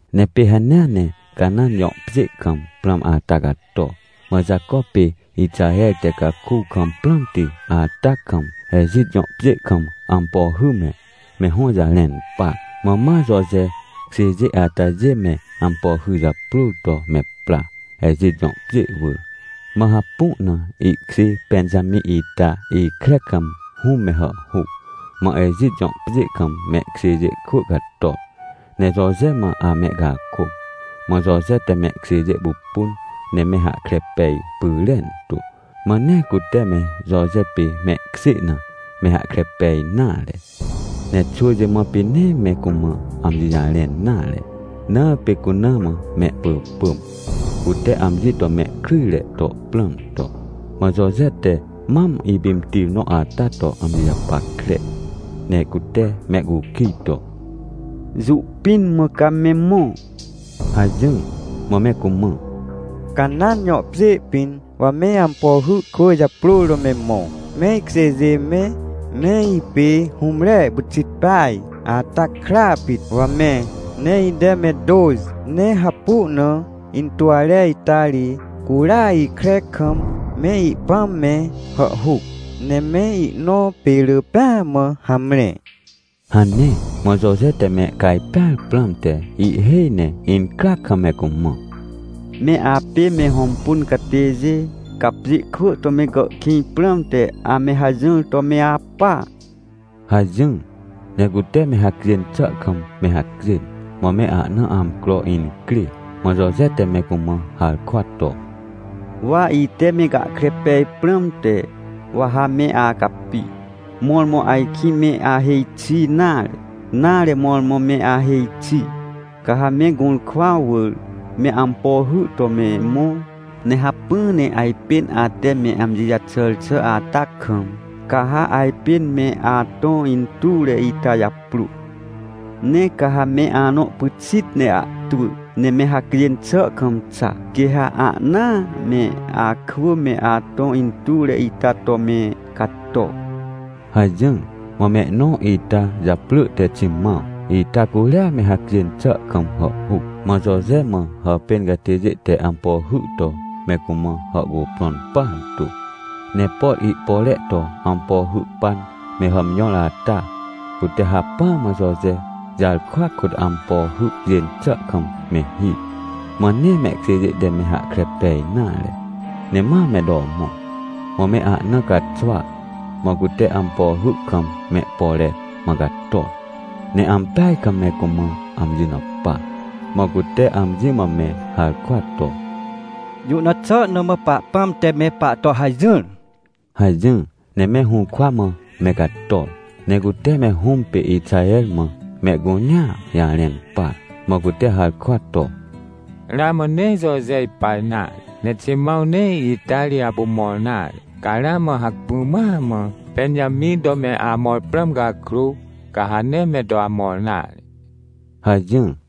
Ne pê hanea ne Canãn jõ pjê kam prãm ata cato. Mã Jaco pê Ixaher te caku kam prãmti ata kam, Ejit jõ pjê kam ampo hy me, me hõ jarẽn par. Mã ma Joje kjêjê atajê me ampo hy japrôr to me pra, Ejit jõ pjê wỳr. Mã hapu na ihkjê Pẽnjamĩ ita ikre kam hũm me hàhhuc. Mã Ejit jõ pjê kam mehkjêjê kwỳ cator, ne Joje mã amehcakôc. Mã Joje te mehkjêjê pupun ne me hahkre pej pyrentu, mã nee cute me Joje pê mehkjê na, me hahkre pej nare. Ne xwỳjê mã pê nee me cumã amji jarẽn nare, na pê cuna mã mehpỳpỳm, cute amji to mehkryjre to prãm to. Mã Joje te mam ipimtir nõ ata to amji japackre. Ne cute mehcukij to: — Jũ pĩn mã ca me mõ? — hajỹr. Mã me cumã: — Canãn jõ pjê pĩn wa me ampo hy kwỳ japrôr to me mõ. Me ikjêjê me, me ipê hũmre pyxit peaj ata kra pit, wa me. Ne ite me tôxi, ne hapu na intuwre ita ri curia ikre kam me ipãm me hàhhuc, ne me inõ pê rỳ pêa mã hamre — hane. Mã Joje te me cajpẽar prãmte ihhêj ne incryac kam me cumã: — Me apê me hõmpun catêjê, ca pjê kwỳ to me gàhkĩj prãmte ame hajỹr to me apa — hajỹr. Ne cute me hacjên xà kam me hacjên, mã me ahna amcro incrê. Mã Joje te me cumã harkwa to: — Wa ite me gahkre pej prãmte, wa ha me acapi, mõrmõ ajkĩ me ahêj xi nare, nare, mõrmõ me ahêj xi. Ca ha me gũrkwa wỳr me ampo hy to me mõ, ne hacpỹ ne ajpên ate me amji jaxàr xà ata kam, ca ha ajpên me atõ intuwre ita japrô. Ne ca ha me anõ pyxit ne ahtwỳ, ne me hacjên xà kam xa, quê ha ahnaa me akwỳ me atõ intuwre ita to me cato — hajỹr. Mã mehnõ ita japrỳ te Ximãw ita curia me hacjên xà kam hàhhuc. Mã Joje mã hàpên catêjê te ampo hy to me cumã hàhcuprõn partu, ne por ihpore to ampo hy pan me hàmjõr ata, cute hacpỹa mã Joje jarkwa kôt ampo hy cjên xà kam me hir. Mã nee mehkjêjê te me hahkre pej nare. Ne ma me to mõ. Mã me ahna caxwa, mã cute ampo hy kam mehpore mã cator, ne ampeaj kam me cumã amji na pa, mã cute amji mã me harkwa to: — Jũ na xà na mã Pahpãm te me pahto hajỹr? — hajỹr. Ne me hũrkwa mã me cator, ne cute me hũm pê Ixaher mã mehcunea jarẽn par. Mã cute harkwa to: — Ramã nee Joje ipa nare, ne Ximãw nee ita ri apu mõr nare, ca ramã hacpỹ mãa mã Pẽnjamĩ to me amõr prãm cakrô, ca ha nee me to amõr nare — hajỹr.